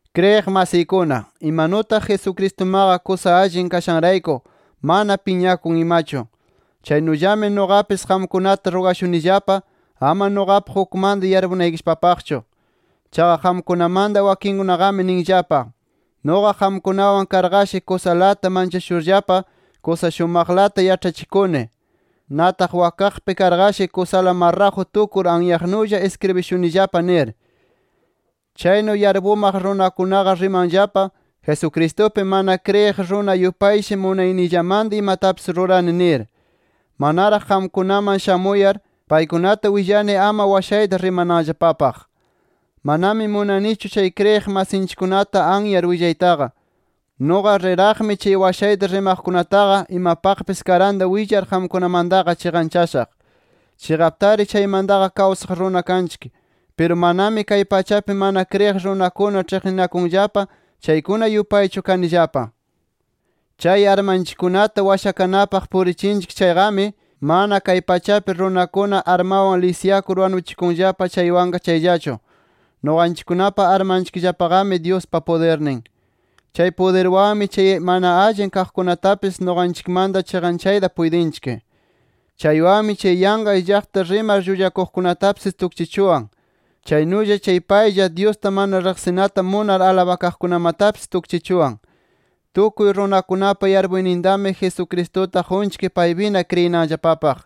Kriyiq masiykuna, imanutaq Jesucristumaqa kusa allin kashanrayku mana piñakun imachu, chaynullami nuqapis qamkunata rugashunillapa ama nuqapaq ukmanta yarpunaykillapapaqchu. Chaqa qamkunamanta wakinkunaqami ninllapa: Nuqa qamkunawan karqashi kusalata manchashurllapa kusa shumaqlata yaĉhachikuni. Nataq wakaqpi karqashi kusala marraju tukur anyaqnulla iskribishunillapa nir. Chaynu yarpumaq runakunaqa rimanllapa, Jesucristupi mana kriyiq runa yupayshi munayniyllamanta imatapis rurani nir. Manaraq qamkunaman shamuyar, paykunata willani ama washayta rimananllapapaq. Manami munanichu chay kriyiq masinchikkunata anyar willaytaqa. Nuqa rir-raqmi chay washayta rimaqkunataqa, imapaqpis karanta willar qamkunamantaqa chiqanchashaq. Chiqaptari chaymantaqa kawsaq runa kanchik. Piru manami kay pachapi mana kriyiq runakuna ĉhiqninakunllapa chaykuna yupaychu kanillapa. Chay armanchikkunata washakanapaq purichinchik chayqami, mana kay pachapi runakuna armanwan lisyakur wanuchikunllapa chaywanqa chayllachu. Nuqanchikkunapa armanchikllapaqami, Dyuspa pudirnin. Chay pudirwanmi chay mana allin kaqkunatapis nuqanchikmanta chiqanchayta puytinchik. Chaywanmi chay yanqa illaqta rimar llullakuqkunatapis tukchichuwan. Chaynulla chay paylla, Dyusta mana riqsinata munar alabakaqkunamatapis, tukchichuwan. Tukuy runakunapa yarpuynintami, Jesucristuta qunchik paypina kriyinanllapapaq.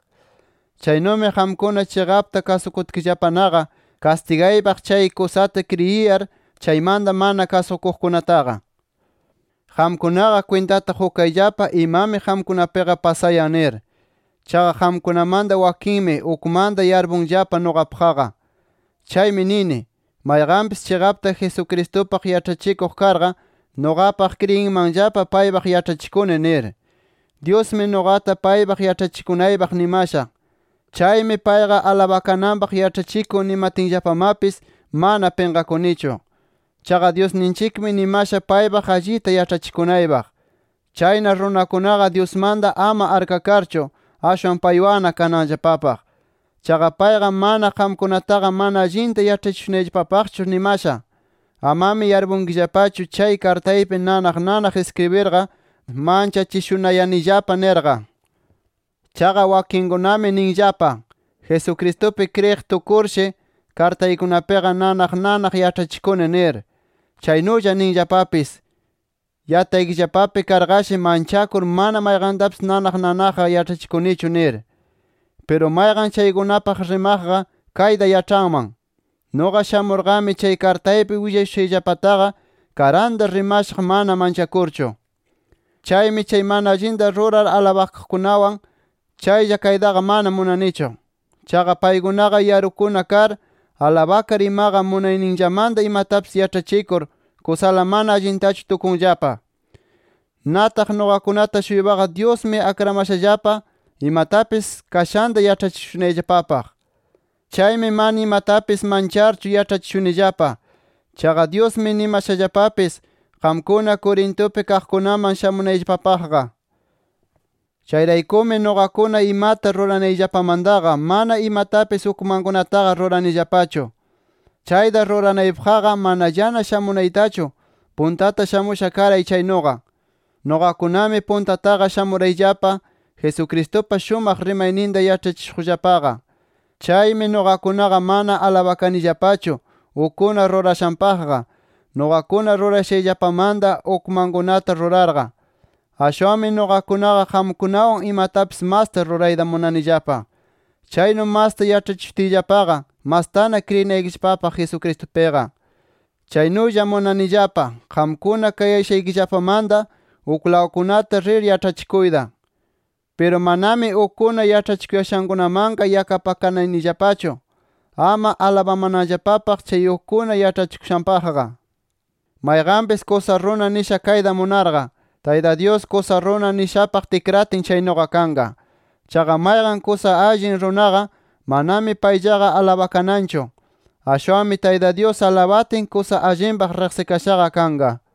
Chaynumi qamkuna chiqapta kasukutkillapanaqa, kastigaypaq chay kusata kriyiyar, chaymanta mana kasukuqkunataqa. Qamkunaqa kwintata qukayllapa imami qamkunapiqa pasayan nir. Chaqa qamkunamanta wakinmi, ukmanta yarpunllapa nuqapaqqa. Chaymi nini, mayqanpis chiqapta Jesucristupaq yaĉhachikuq karqa, nuqapaq kriyinmanllapa paypaq yaĉhachikuni nir. Dyusmi nuqata paypaq yaĉhachikunaypaq nimasha. Chaymi, payqa alabakananpaq yaĉhachikun nimatinllapamapis, mana pinqakunichu. Chaqa Dyusninchikmi nimasha paypaq allita yaĉhachikunaypaq. Chayna runakunaqa, Dyusmanta ama akrakarchu, ashwan paywanna kananllapapaq. Chaqa payqa mana qamkunataqa mana allinta yaĉhachishunayllapapaqchu nimasha. Amami yarpunkillapachu chay kartaypi nanaq nanaq iskribirqa manchachishunayanillapa nirqa. Chaqa wakinkunami ninllapa: Jesucristupi kriyiq tukurshi, kartaykunapiqa nanaq nanaq yaĉhachikuni nir. Chaynulla ninllapapis, yataykillapapi karqashi, manchakur mana mayqantapis nanaq nanaqqa yaĉhachinichu nir. Piru mayqan kaykunapaq rimaqqa, kayta yaĉhanman: Nuqa shamurqami chay kartaypi willashushayllapataqa, karanta rimashaq mana manchakurchu. Chaymi chay mana allinta rurar alabakaqkunawan chaylla kaytaqa mana munanichu. Chaqa paykunaqa yarukuna kar, alabakar imaqa, munayninllamanta imatapis yaĉhachikur, kusala mana allintachu tukunllapa. Nataq nuqakunata-shuypaqa, Dyusmi akramashallapa imatapis kashanta yaĉhachishunayllapapaq. Chaymi mana imatapis mancharchu yaĉhachishunillapa. Chaqa Dyusmi nimashallapapis qamkuna Corintupi kaqkunaman shamunayllapapaqqa. Chayraykumi nuqakuna imata ruranayllapamantaqa, mana imatapis ukmankunataqa ruranillapachu. Chayta ruranaypaqqa, manallana shamunaytachu puntata shamusha karay chaynuqa. Nuqakunami puntataqa shamurayllapa Jesucristupa shumaq rimayninta yaĉhachishuqllapaqa. Chaymi, nuqakunaqa mana alabakanillapachu ukkuna rurashanpaqqa, nuqakuna rurayashayllapamanta ukmankunata rurarqa. Ashwanmi nuqakunaqa qamkunawan imatapis masta rurayta munanillapa. Chaynu masta yaĉhachishutiyllapaqa, mastana kriyinaykillapapaq Jesucristupiqa. Chaynulla munanillapa, qamkuna kayashaykillapamanta uklawkunata rir yaĉhachikuyta. Piru manami ukkuna yaĉhachikuyashankunamanqa yakapakanayanillapachu, ama alabamananllapapaq chay ukkuna yaĉhachikushanpaqqa. Mayqanpis kusa runa nisha kayta munarqa, Tayta Dyus kusa runa nishapaq tikratin chaynuqa kanqa. Chaqa mayqan kusa allin runaqa, manami payllaqa alabakananchu. Ashwanmi Tayta Dyus alabatin, kusa allinpaq riqsikashaqa kanqa.